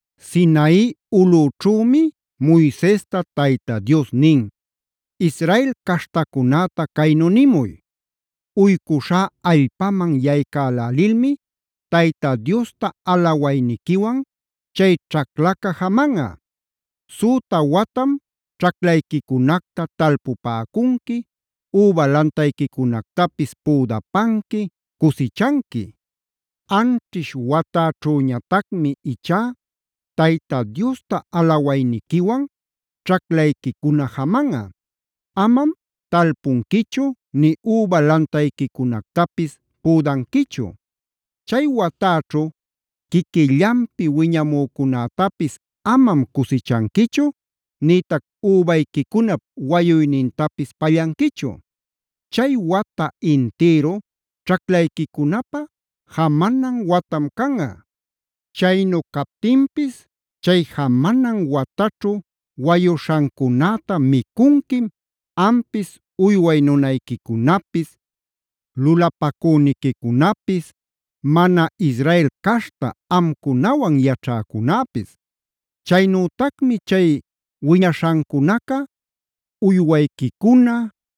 Sinai ulüćhümi Moisesta Tayta Dios nin: “Israel caśhtacunäta caynu nimuy: ‘Uycuśhä allpaman yaycälälilmi Tayta Diosta alawayniquiwan chay ćhaclaca jamanꞌa. Süta watam ćhaclayquicunacta talpupäcunqui, üba lantayquicunactapis püdapanqui, cusichanqui. Anćhish watäćhüñatacmi ichá Tayta Diosta alawayniquiwan ćhaclayquicuna jamanꞌa; amam talpunquichu nï üba lantayquicunactapis püdanquichu. Chay watäćhu quiquillanpi wiñamücunätapis amam cusichanquichu nïtac übayquicunap wayuynintapis pallanquichu. Chay wata-intïru ćhaclayquicunapä jamanan watam canꞌa. Chaynu captinpis chay jamanan wataćhu wayuśhancunäta micunquim ampis, uyway nunayquicunapis, lulapacüniquicunapis, mana Israel caśhta amcunawan yaćhäcunäpis. Chaynütacmi chay wiñaśhancunaca uywayquicuna,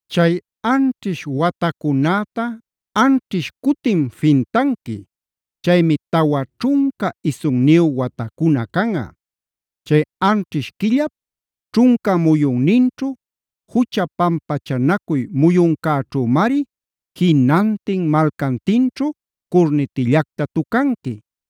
“ ‘Chay anćhish watacunäta anćhish cutim fintanqui. Chaymi tawa ćhunca isunniyu watacuna canꞌa. Chay anćhish quillap ćhunca muyunninćhu, jucha pampachanacuy muyuncäćhümari jinantin malcantinćhu curnitillacta tucanqui.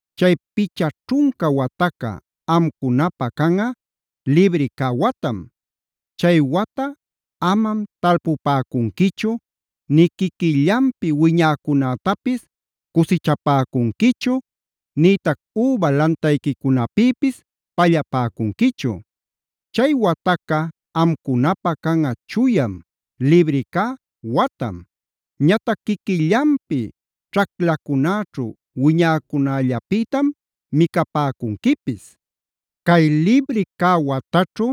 Chay picha ćhunca wataca amcunapä canꞌa libri cä watam. Chay wata amam talpupäcunquichu nï quiquillanpi wiñäcunätapis cusichapäcunquichu, nïtac üba lantayquicunapïpis pallapäcunquichu. Chay wataca amcunapä canꞌa chuyam, libri cä watam. Ñatac quiquillanpi ćhaclacunäćhu wiñäcunällapïtam micapäcunquipis. “ ‘Cay libri cä wataćhu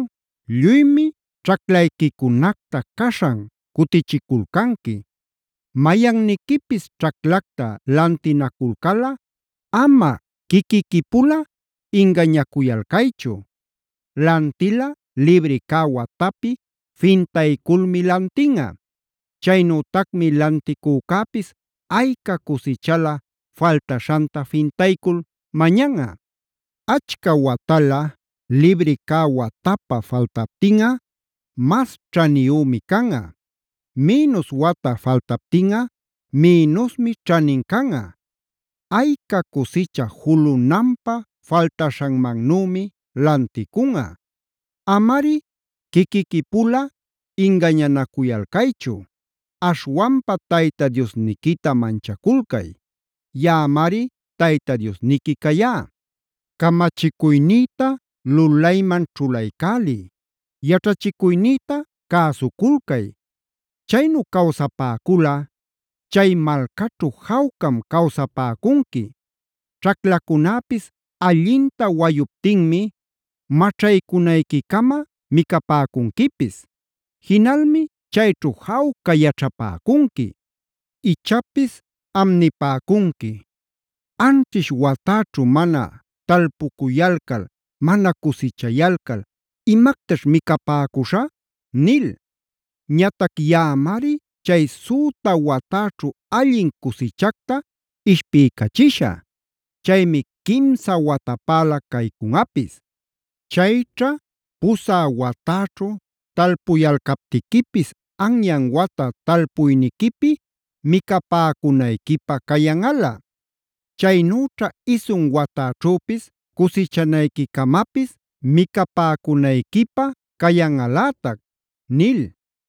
lluymi ćhaclayquicunacta caśhan cutichiculcanqui. Mayanniquipis ćhaclacta lantinaculcalꞌa ama quiquiquipula ingañacuyalcaychu. Lantilꞌa libri cä watapi fintayculmi lantinꞌa. Chaynütacmi lanticücäpis ayca cusichala faltaśhanta fintaycul mañanꞌa. Achca watala libri cä watapä faltaptinꞌa mas ćhaniyümi canꞌa; minus wata faltaptinꞌa minusmi ćhanin canꞌa. Ayca cusicha julunanpä faltaśhanmannümi lanticunꞌa. “ ‘Amari quiquiquipula ingañanacuyalcaychu. Aśhwanpa Tayta Diosniquita manchaculcay. Yaꞌamari Tayta Diosniqui cayá. Camachicuynïta lulayman ćhulaycäliy; yaćhachicuynïta cäsuculcay. Chaynu cawsapäculꞌa chay malcaćhu jawcam cawsapäcunqui. Ćhaclacunäpis allinta wayuptinmi maćhaycunayquicama micapäcunquipis. Jinalmi chayćhu jawca yaćhapäcunqui. “ ‘Ichapis am nipäcunqui: “Anćhish watäćhu mana talpucuyalcal, mana cusichayalcal, ¿imactaćh micapäcuśhä?” nil. Ñatac yaꞌamari chay süta watäćhu allin cusichacta ishpiycachishä. Chaymi quimsa watapäla cacunꞌapis. Chayćha pusä watäćhu talpuyalcaptiquipis anyan wata talpuyniquipi micapäcunayquipä cayanꞌala. Chaynüćha isun watäćhüpis cusichanayquicamapis micapäcunayquipä cayanꞌalätac’ nil.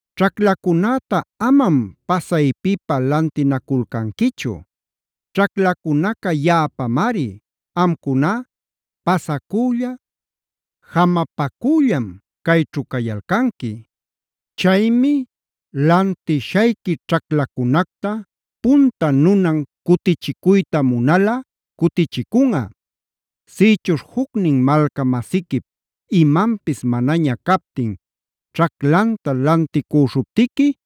“Ćhaclacunäta amam pasaypipä lantinaculcanquichu. Ćhaclacunaca yaꞌapamari; amcuná pasacülla, jamapacüllam cayćhu cayalcanqui. Chaymi lantishayqui ćhaclacunacta punta nunan cutichicuyta munalꞌa cutichicunꞌa. “Sïchuśh jucnin malca-masiquip imanpis manaña captin ćhaclanta lanticüśhuptiqui,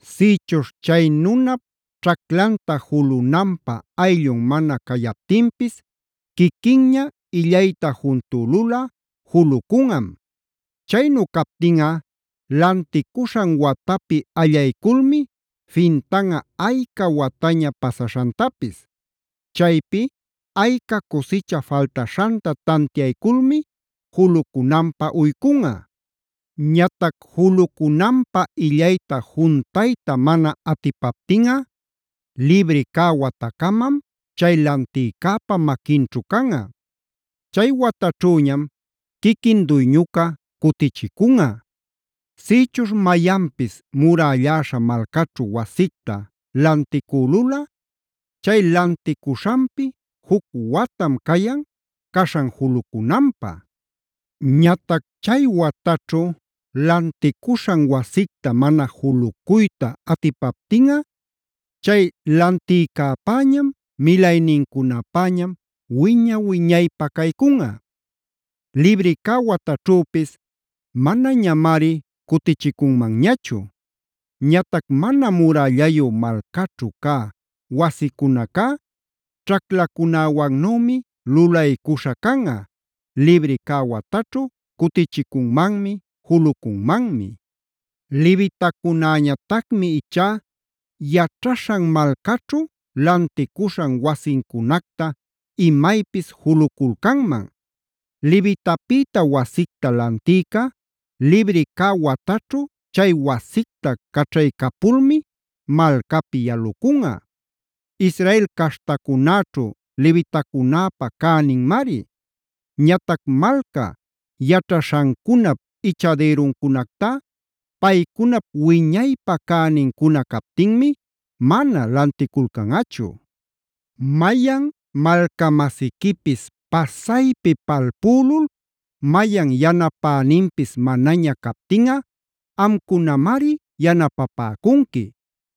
“Sïchuśh chay nunap ćhaclanta julunanpä ayllun mana cayaptinpis quiquinña illayta juntülulꞌa julucunꞌam. Chaynu captinꞌa lanticuśhan watapi allayculmi fintanꞌa ayca wataña pasaśhantapis. Chaypi ayca cusicha faltaśhanta tantiayculmi julucunanpä uycunꞌa. Ñatac julucunanpä illayta juntuyta mana atipaptinꞌa libri cä watacamam chay lantïcäpa maquinćhu canꞌa. Chay wataćhüñam quiquin duyñuca cutichicunꞌa. “Sïchuśh mayanpis murälläśha malcaćhu wasicta lanticülulꞌa, chay lanticuśhanpi juc watam cayan caśhan julucunanpä. Ñatac chay wataćhu lanticuśhan wasicta mana julucuyta atipaptinꞌa chay lantïcäpäñam, milaynincunapäñam wiña-wiñaypä caycunꞌa. Libri cä wataćhüpis manañamari cutichicunmanñachu. Ñatac mana murällayu malcaćhu cä wasicunacá ćhaclacunäwannümi lulaycuśhä canꞌa: libri cä wataćhu cutichicunmanmi, julucunmanmi. “Levitacunäñatacmi ichá yaćhaśhan malcaćhu lanticuśhan wasincunacta imaypis juluculcanman. Levitapïta wasicta lantïca libri cä wataćhu chay wasicta caćhaycapulmi malcapi yalucunꞌa. Israel caśhtacunäćhu levitacunäpa cäninmari. Ñatac malca yaćhaśhancunap ichadïruncunactá paycunap wiñaypä cänincuna captinmi mana lanticulcanꞌachu. “Mayan malca-masiquipis pasaypi palpülul mayan yanapäninpis manaña captinꞌa amcunamari yanapapäcunqui.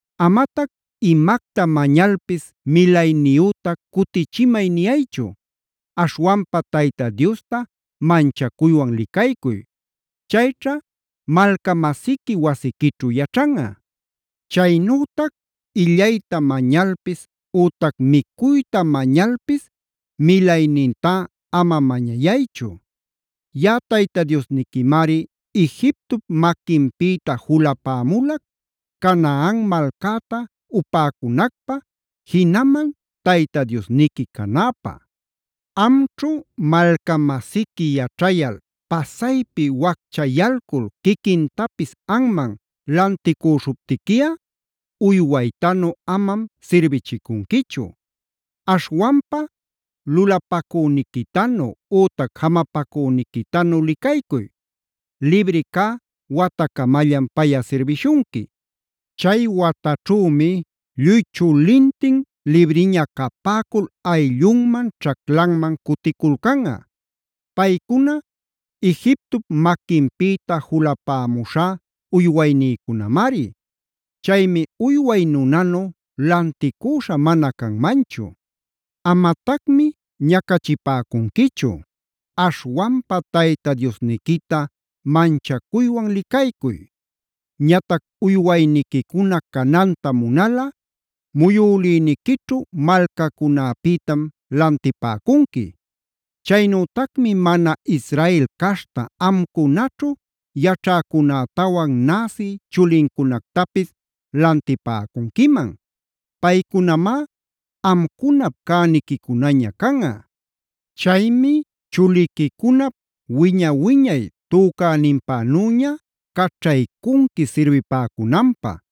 Amatac imacta mañalpis milayniyüta cutichimay niyaychu. Aśhwanpa Tayta Diosta manchacuywan licaycuy. Chayćha malca-masiqui wasiquićhu yaćhanꞌa. Chaynütac illayta mañalpis ütac micuyta mañalpis milaynintá ama mañayaychu.d Yaꞌa Tayta Diosniquimari Egiptop maquinpïta julapämulac Canaan malcäta upäcunacpä, jinaman Tayta Diosniqui canäpä. “Amćhu malca-masiqui yaćhayal pasaypi wacchayalcul quiquintapis anman lanticüśhuptiquiꞌa uywaytanu amam sirbichicunquichu. Aśhwanpa lulapacüniquitanu ütac jamapacüniquitanu licaycuy; libri cä watacamallam payꞌa sirbishunqui. Chay wataćhümi lluy chulintin libriña capäcul ayllunman, ćhaclanman cuticulcanꞌa. Paycuna Egiptop maquinpïta julapämuśhá uywaynïcunamari. Chaymi uyway nunanu lanticüśha mana canmanchu. Amatacmi ñacachipäcunquichu; aśhwanpa Tayta Diosniquita manchacuywan licaycuy. “Ñatac uywayniquicuna cananta munalꞌa muyülïniquićhu malcacunäpïtam lantipäcunqui. Chaynütacmi mana Israel caśhta amcunaćhu yaćhäcunätawan näsi chulincunactapis lantipäcunquiman. Paycunamá amcunap cäniquicunaña canꞌa. Chaymi chuliquicunap wiña-wiñay tücäninpänüña caćhaycunqui sirbipäcunanpä.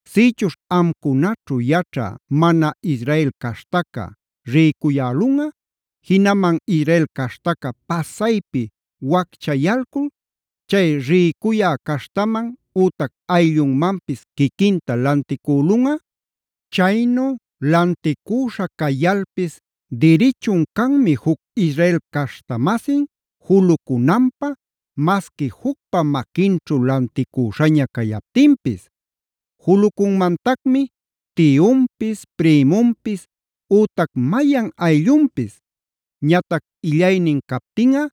“Sïchuśh amcunaćhu yaćha mana Israel caśhtaca rïcuyälunꞌa, jinaman Israel caśhtaca pasaypi wacchayalcul chay rïcuya caśhtaman ütac ayllunmanpis quiquinta lanticülunꞌa. Chaynu lanticüśha cayalpis dirichun canmi juc Israel caśhta-masin julucunanpä masqui jucpa maquinćhu lanticüśhaña cayaptinpis. Julucunmantacmi tiyunpis, prïmunpis ütac mayan ayllunpis. Ñatac illaynin captinꞌa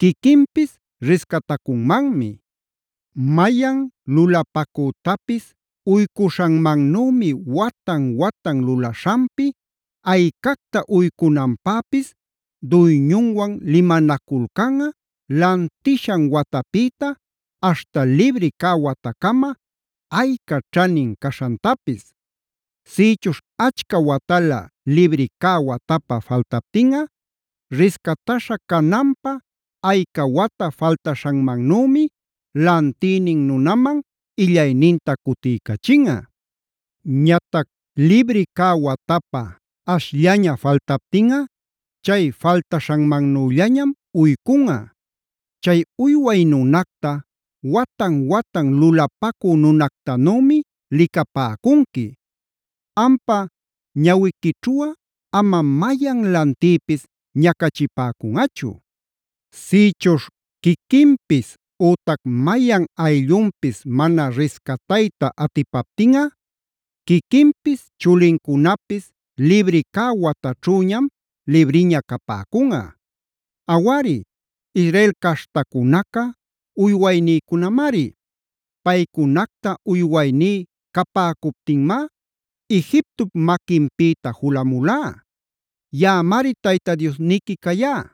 quiquinpis riscatacunmanmi. Mayan lulapacütapis uycuśhanmannümi watan-watan lulaśhanpi aycacta uycunanpäpis duyñuwan limanaculcanꞌa lantishan watapïta aśhta libri cä watacama ayca ćhanin caśhantapis. Sïchuśh achca watalä libri cä watapä faltaptinꞌa riscataśha cananpä ayca wata faltaśhanmannümi lantïnin nunaman illayninta cutiycachinꞌa. Ñatac libri cä watapä ashllaña faltaptinꞌa chay faltaśhanmannüllañam uycunꞌa. Chay uyway nunacta watan-watan lulapacü nunactanümi licapäcunqui. Ampa ñawiquićhuꞌa amam mayan lantïpis ñacachipäcunꞌachu. “Sïchuśh quiquinpis ütac mayan ayllunpis mana riscatayta atipaptinꞌa, quiquinpis chulincunapis libri cä wataćhüñam libriña capäcunꞌa. Awari, Israel caśhtacunaca uywaynïcunamari. Paycunacta uywayní capäcuptinmá Egiptop maquinpïta julamulá. Yaꞌamari Tayta Diosniqui cayá.